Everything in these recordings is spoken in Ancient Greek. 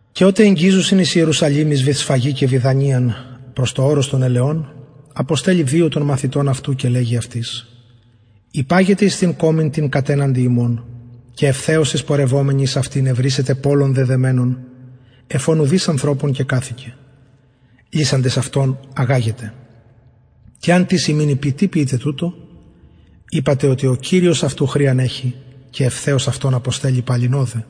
και οτε εγγιζουσιν εις ιερουσαλημ εις βηθσφαγη και βηθανιαν προς το ορος των ελαιων αποστελλει δυο των μαθητων αυτου και λεγει αυτοις υπαγετε εις την κωμην την κατεναντι υμων και ευθεως εισπορευομενοι εις αυτην ευρησετε πωλον δεδεμενον εφ ον ουδεις ανθρωπων κεκαθικεν λυσαντες αυτον αγαγετε και εαν τις υμιν ειπη τι ποιειτε τουτο ειπατε οτι ο κυριος αυτου χρειαν εχει και ευθεως αυτον αποστελλει ωδε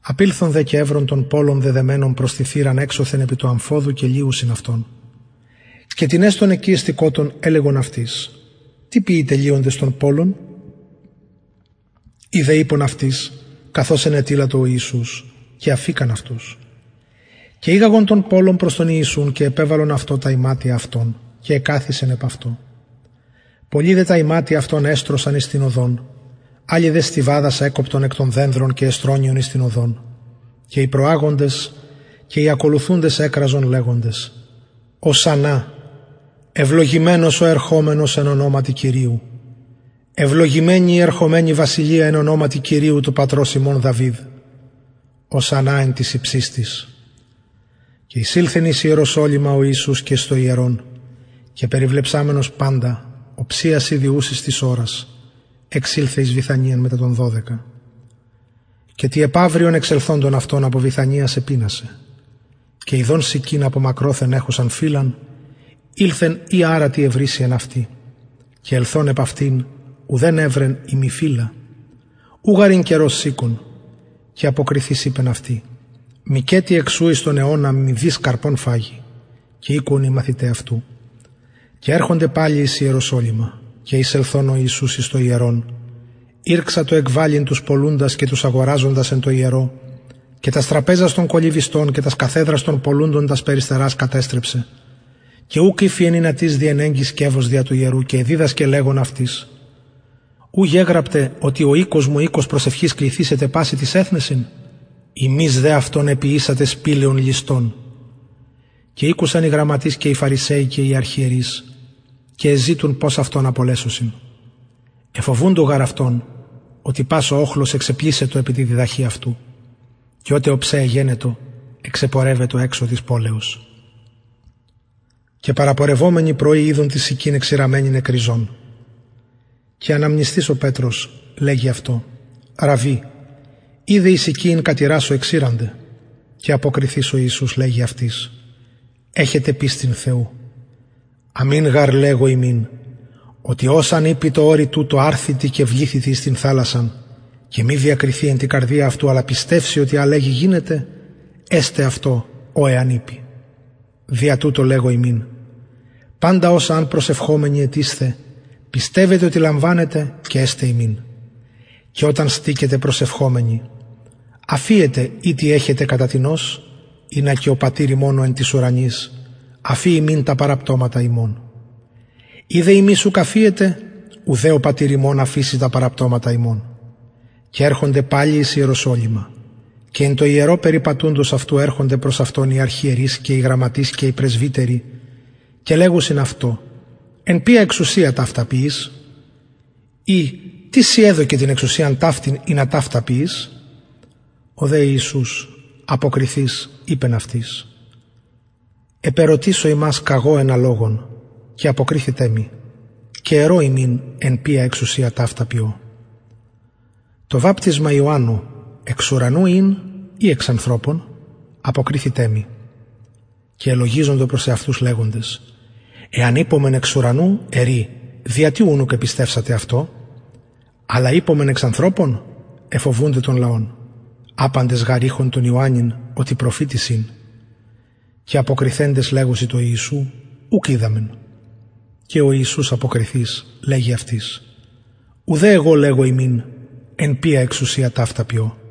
απηλθον δε και ευρον πωλον δεδεμενον προς την θυραν εξω επι του αμφοδου και λυουσιν αυτον και τινες των εκει εστηκοτων ελεγον αυτοις τι ποιειτε λυοντες τον πωλον οι δε ειπον αυτοις καθως ενετειλατο ο ιησους και αφηκαν αυτους και ηγαγον τον πωλον προς τον ιησουν και επεβαλον αυτω τα ιματια αυτων και εκαθισεν επ αυτω πολλοι δε τα ιματια αυτων εστρωσαν εις την οδον αλλοι δε στοιβαδας εκοπτον εκ των δενδρων και εστρωννυον εις την οδον και οι προαγοντες και οι ακολουθουντες εκραζον λεγοντες ωσαννα ευλογημενος ο ερχομενος εν ονοματι κυριου ευλογημενη η ερχομενη βασιλεια εν ονοματι κυριου του πατρος ημων δαυιδ ωσαννα εν τοις υψιστοις και εισηλθεν εις ιεροσολυμα ο ιησους και εις το ιερον και περιβλεψαμενος παντα οψιας ηδη ουσης της ωρας εξηλθεν εις βηθανιαν μετα των δωδεκα και τη επαυριον εξελθοντων αυτων απο βηθανιας επεινασεν και ιδων συκην μακροθεν εχουσαν φυλλα ηλθεν ει αρα ευρησει τι εν αυτη και ελθων επ αυτην ουδεν ευρεν ει μη φυλλα ου γαρ ην καιρος συκων και αποκριθεις ο ιησους ειπεν αυτη μηκετι εκ σου εις τον αιωνα μηδεις καρπον φαγοι και ηκουον οι μαθηται αυτου και ερχονται εις ιεροσολυμα και εισελθων ο ιησους εις το ιερον ηρξατο εκβαλλειν τους πωλουντας και αγοραζοντας εν τω ιερω και τας τραπεζας των κολλυβιστων και τας καθεδρας των πωλουντων τας περιστερας κατεστρεψεν και ουκ ηφιεν ινα τις διενεγκη σκευος δια του ιερου και εδιδασκεν λεγων αυτοις ου γεγραπται οτι ο οικος μου οικος προσευχης κληθησεται πασιν τοις εθνεσιν υμεις δε εποιησατε αυτον σπηλαιον ληστων και ηκουσαν οι γραμματεις και οι αρχιερεις και εζητουν πως αυτον απολεσωσιν εφοβουντο γαρ αυτον οτι πας ο οχλος εξεπλησσετο επι τη διδαχη αυτου και οτε οψε εγενετο εξεπορευετο εξω της πολεως και πρωι παραπορευομενοι ειδον την συκην εξηραμμενην εκ ριζων και αναμνησθεις ο πετρος λεγει αυτω ραββι ιδε η συκη ην κατηρασω εξηρανται και αποκριθεις ο ιησους λεγει αυτοις εχετε πιστιν θεου αμην γαρ λεγω υμιν οτι ος αν ειπη τω ορει τουτω αρθητι και βληθητι εις την θαλασσαν και μη διακριθη εν τη καρδια αυτου αλλα πιστευση οτι α λεγει γινεται εσται αυτω ο εαν ειπη δια τουτο λεγω υμιν παντα οσα αν προσευχομενοι αιτησθε πιστευετε οτι λαμβανετε και εσται υμιν και οταν στηκητε προσευχομενοι αφιετε ει τι εχετε κατα τινος ινα και ο πατηρ υμων ο εν τοις ουρανοις αφη υμιν τα παραπτωματα υμων ει δε υμεις ουκ αφιετε ουδε ο πατηρ υμων ο εν τοις ουρανοις αφησει τα παραπτωματα υμων και ερχονται παλιν εις ιεροσολυμα και εν τω ιερω περιπατουντος αυτου ερχονται προς αυτον οι αρχιερεις και οι γραμματεις και οι πρεσβυτεροι και λεγουσιν αυτω εν ποια εξουσια ταυτα ποιεις και τις σοι την εξουσιαν ταυτην εδωκεν ινα ταυτα ποιης ο δε ιησους αποκριθεις ειπεν αυτοις επερωτησω υμας και εγω ενα λογον και αποκριθητε μοι και ερω υμιν εν ποια εξουσια ταυτα ποιω το βαπτισμα ιωαννου εξ ουρανου ην η εξ ανθρωπων αποκριθητε μοι και ελογιζοντο προς εαυτους λεγοντες εαν ειπωμεν εξ ουρανου ερει δια τι ουν ουκ επιστευσατε αυτω αλλ ειπωμεν εξ ανθρωπων εφοβουντο τον λαον απαντες γαρ ειχον τον ιωαννην οτι οντως προφητης ην και αποκριθεντες λεγουσιν τω ιησου ουκ οιδαμεν και ο ιησους αποκριθεις λεγει αυτοις ουδε εγω λεγω υμιν εν ποια εξουσια ταυτα ποιω